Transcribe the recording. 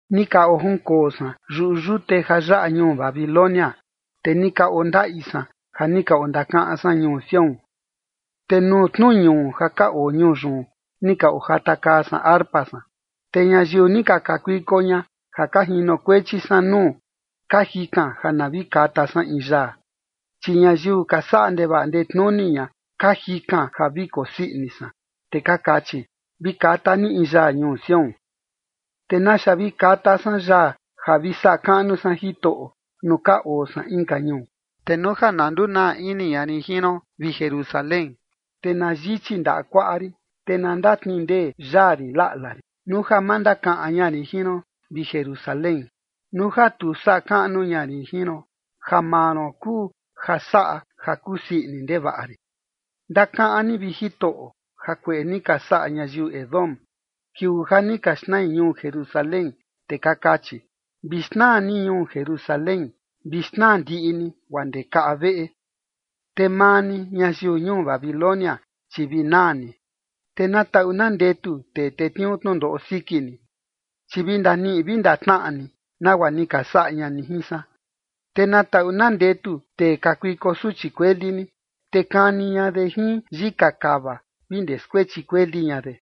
Ni ka ojunkoo san yuꞌu yute ja yaꞌa ñuu Babilonia, te ni ka ondaꞌi san, ja ni ka ondakaꞌan san ñuu Sión. Te nuu tnu ñuu ja oo ñuu yun, ni ka ojatakaa san arpa san. Te ñayiu ni ka kakuiko ña ja ka jinokuechi san nuu, ka jikan ja na vi kata san in yaa. Chi ñayiu ka saꞌa ndevaꞌa ndetnuni ña ka jikan ja vi kosii ini san, te ka kachi: “Vi kata ni in yaa ñuu Sión”. ¿Te naxa vi kata san yaa ja vi saꞌa kaꞌnu san Jitoꞌo, nuu ka oo san inka ñuu? Te nuu ja na ndunaa ini ña rin jin ron, vi Jerusalén, te na yichi ndaꞌa kuaꞌa rin. Te na ndatnindee yaa rin laꞌla rin, nuu ja ma ndakaꞌan ña rin jin ron, vi Jerusalén, nuu ja tu saꞌa kaꞌnu ña rin jin ron, ja maa ron kuu ja saꞌa ja kusii ini ndevaꞌa rin. Ndakaꞌan ni, vi Jitoꞌo, jakueꞌe ni ka saꞌa ñayiu Edom, kiuu ja ni ka xnai ñuu Jerusalén, te ka kachi: “Vi xnaa ni ñuu Jerusalén. Vi xnaa ndiꞌi ni guaa ndee kaꞌa veꞌe.” Te maa ni, ñayiu ñuu Babilonia, chi vi naa ni. Te na taꞌu na ndetu tee tetniuu tnundoꞌo siki ni, chi vi ndaniꞌi vi ndatnaꞌa ni nagua ni ka saꞌa ña ni jin san. Te na taꞌu na ndetu tee kakuiko suchi kueli ni, te kani ña de jin yika kava vi ndee skuechi kueli ña de.